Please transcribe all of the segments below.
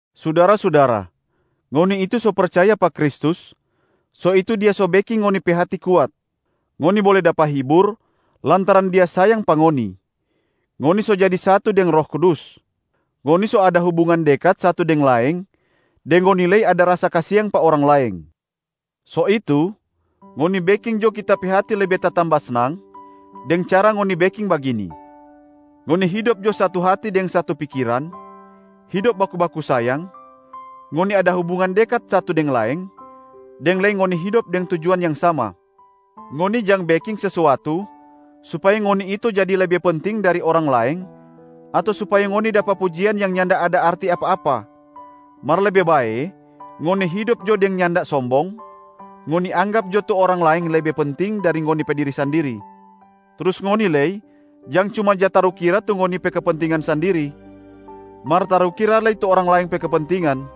Sudara-sudara, ngoni itu so percaya pa Kristus, so itu Dia so beking ngoni pe hati kuat, ngoni bole dapa hibur lantaran Dia sayang pa ngoni, ngoni so jadi satu deng Roh Kudus, ngoni so ada hubungan dekat satu deng laeng, deng ngoni lei ada rasa kasiang pa orang laeng. So itu, ngoni beking jo kita pe hati lebe tatamba snang deng cara ngoni beking bagini: ngoni hidop jo satu hati deng satu pikiran, hidop baku-baku sayang, ngoni ada hubungan dekat satu deng laeng, deng lei ngoni hidop deng tujuan yang sama. Ngoni jang beking sesuatu supaya ngoni itu jadi lebe penting dari orang laeng ato supaya ngoni dapa pujian yang nyanda ada arti apa-apa, mar lebe bae ngoni hidop jo deng nyanda sombong, ngoni anggap jo tu orang laeng lebe penting dari ngoni pe diri sandiri. Trus ngoni lei jang cuma ja tarukira tu ngoni pe kepentingan sandiri, mar tarukira lei tu orang laeng pe kepentingan.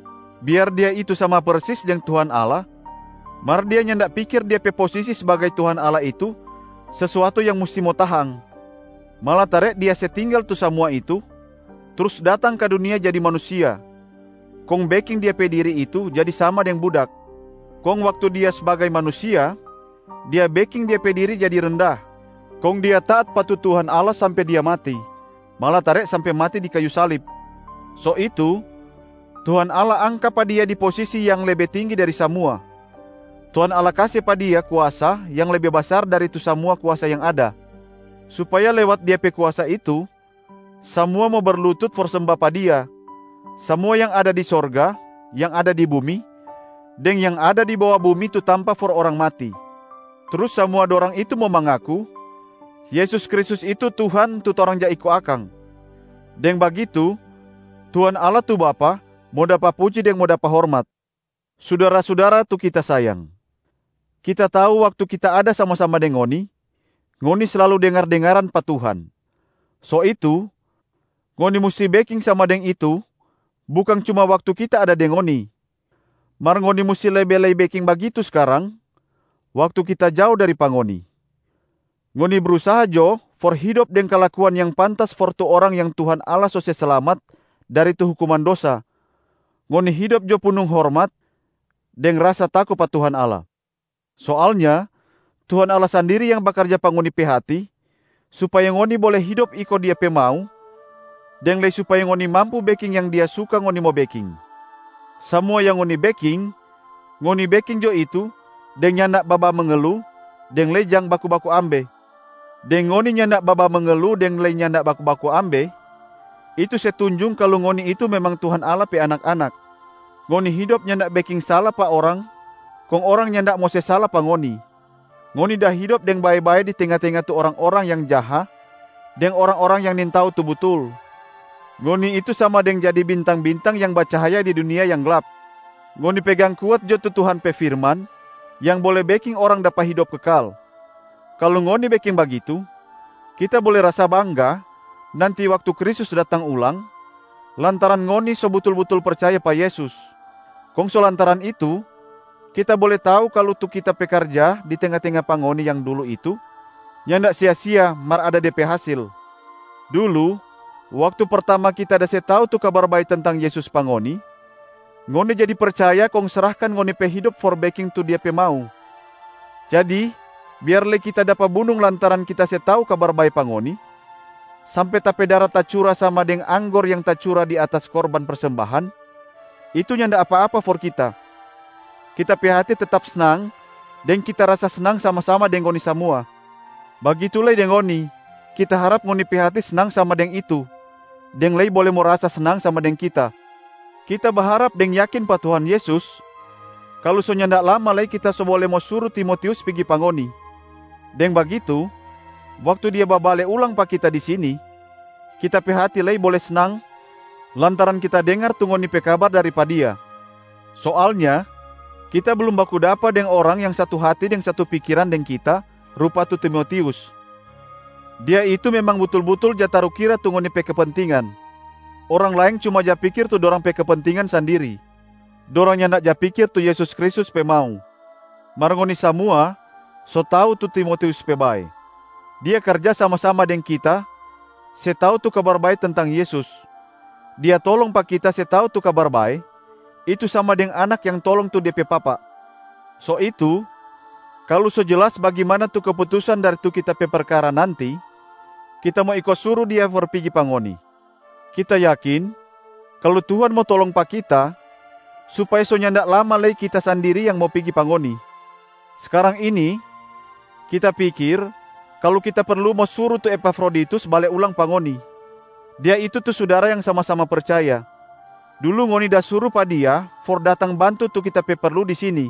Biar Dia itu sama persis deng Tuhan Allah, mar Dia nyanda pikir Dia pe posisi sbagai Tuhan Allah itu sesuatu yang musti mo tahang, malatare Dia se tinggal tu samua itu, trus datang ka dunia jadi manusia, kong beking Dia pe diri itu jadi sama deng budak. Kong waktu Dia sbagai manusia, Dia beking Dia pe diri jadi renda, kong Dia taat pa tu Tuhan Allah sampe Dia mati, malatare sampe mati di kayu salib. So itu, Tuhan Allah angka pa Dia di posisi yang lebe tinggi dari samua, Tuhan Allah kase pa Dia kuasa yang lebe basar dari tu samua kuasa yang ada, supaya lewat Dia pe kuasa itu, samua mo berlutut for semba pa Dia, samua yang ada di sorga, yang ada di bumi, deng yang ada di bawa bumi tu tampa for orang mati. Trus samua dorang itu mo mangaku, “Yesus Kristus itu Tuhan tu torang ja iko akang,” deng bagitu Tuhan Allah tu Bapa mo dapa puji deng mo dapa hormat. Sudara-sudara tu kita sayang, kita tau waktu kita ada sama-sama deng ngoni, ngoni slalu dengar-dengaran pa Tuhan. So itu, ngoni musti beking sama deng itu bukang cuma waktu kita ada deng ngoni, mar ngoni musti lebe lei beking bagitu skarang waktu kita jao dari pa ngoni. Ngoni brusaha jo for hidop deng kalakuan yang pantas for tu orang yang Tuhan Allah so se slamat dari tu hukuman dosa, ngoni hidop jo punung hormat deng rasa tako pa Tuhan Allah. Soalnya Tuhan Allah sandiri yang bakarja pa ngoni pe hati supaya ngoni bole hidop iko Dia pe mau deng lei supaya ngoni mampu beking yang Dia suka ngoni mo beking. Samua yang ngoni beking, ngoni beking jo itu deng nyanda babamengelu deng lei jang baku-baku ambe. Deng ngoni nyanda babamengelu deng lei nyanda baku-baku ambe, itu se tunjung kalu ngoni itu memang Tuhan Allah pe anak-anak, ngoni hidop nyanda beking sala pa orang kong orang nyanda mo se sala pa ngoni, ngoni da hidop deng bae-bae di tenga-tenga tu orang-orang yang jaha deng orang-orang yang nintau tu butul, ngoni itu sama deng jadi bintang-bintang yang bacahaya di dunia yang glap. Ngoni pegang kuat jo tu Tuhan pe firman yang bole beking orang dapa hidop kekal. Kalu ngoni beking bagitu, kita bole rasa bangga nanti waktu Kristus datang ulang, lantaran ngoni so butul-butul percaya pa Yesus, kong so lantaran itu kita bole tau kalu tu kita pe karja di tenga-tenga pa ngoni yang dulu itu nyanda sia-sia mar ada de pe hasil. Dulu waktu pertama kita da se tau tu Kabar Bae tentang Yesus pa ngoni, ngoni jadi percaya kong srahkan ngoni pe hidop for beking tu Dia pe mau. Jadi biar lei kita dapa bunung lantaran kita se tau Kabar Bae pa ngoni, sampe ta pe dara tacura sama deng anggor yang da tacura di atas korban persembahan, itu nyanda apa-apa for kita. Kita pe hati tetap snang deng kita rasa snang sama-sama deng ngoni samua. Bagitu lei deng ngoni, kita harap ngoni pe hati snang sama deng itu deng lei bole mo rasa snang sama deng kita. Kita baharap deng yakin pa Tuhan Yesus kalu so nyanda lama lei kita so bole mo suru Timotius pigi pa ngoni. Deng bagitu, waktu dia babale ulang pa kita di sini, kita pe hati lei bole snang lantaran kita dengar tu ngoni pe kabar dari pa dia. Soalnya kita blum baku dapa deng orang yang satu hati deng satu pikiran deng kita rupa tu Timotius, dia itu memang butul-butul ja tarukira tu ngoni pe kepentingan. Orang laeng cuma ja pikir tu dorang pe kepentingan sandiri, dorang nyanda ja pikir tu Yesus Kristus pe mau. Mar ngoni samua so tau tu Timotius pe bae. Dia karja sama-sama deng kita se tau tu Kabar Bae tentang Yesus, dia tolong pa kita se tau tu Kabar bae, itu sama deng anak yang tolong tu de pe papa. So itu, kalu so jelas bagimana tu keputusan dari tu kita pe perkara nanti, kita mo iko suru dia for pigi pa ngoni. Kita yakin kalu Tuhan mo tolong pa kita supaya so nyanda lama lei kita sandiri yang mo pigi pa ngoni. Skarang ini kita pikir kalu kita perlu mo suru tu Epafroditus bale ulang pa ngoni, dia itu tu sudara yang sama-sama percaya. Dulu ngoni da suru pa dia for datang bantu tu kita pe perlu di sini,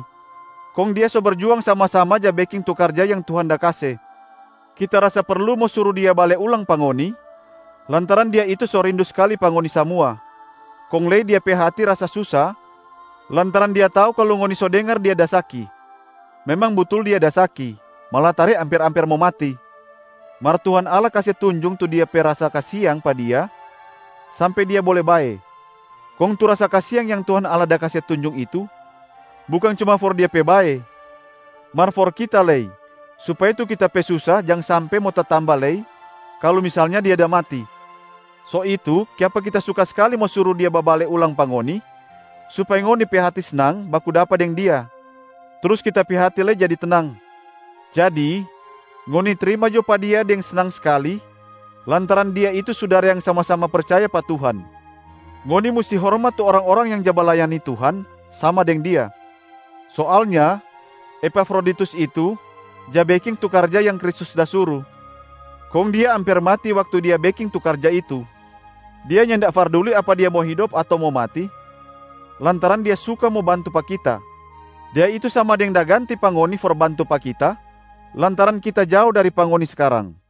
kong dia so berjuang sama-sama ja beking tu karja yang Tuhan da kase. Kita rasa perlu mo suru dia bale ulang pa ngoni lantaran dia itu so rindu skali pa ngoni samua, kong lei dia pe hati rasa susa lantaran dia tau kalu ngoni so dengar dia da saki. Memang butul dia da saki, malatare amper-amper mo mati. Mar Tuhan Allah kase tunjung tu Dia pe rasa kasiang pa dia sampe dia bole bae. Kong tu rasa kasiang yang Tuhan Allah da kase tunjung itu bukang cuma for dia pe bae mar for kita lei supaya tu kita pe susa jang sampe mo tatamba lei kalu misalnya dia da mati. So itu kiapa kita suka skali mo suru dia babale ulang pa ngoni supaya ngoni pe hati snang baku dapa deng dia, trus kita pe hati lei jadi tenang. Jadi, ngoni trima jo pa dia deng snang skali lantaran dia itu sudara yang sama-sama percaya pa Tuhan. Ngoni musti hormat tu orang-orang yang ja balayani Tuhan sama deng dia. Soalnya Epafroditus itu ja beking tu karja yang Kristus da suru, kong dia amper mati waktu dia beking tu karja itu. Dia nyanda farduli apa dia mo hidop ato mo mati lantaran dia suka mo bantu pa kita, dia itu sama deng da ganti pa ngoni for bantu pa kita lantaran kita jao dari pa ngoni skarang.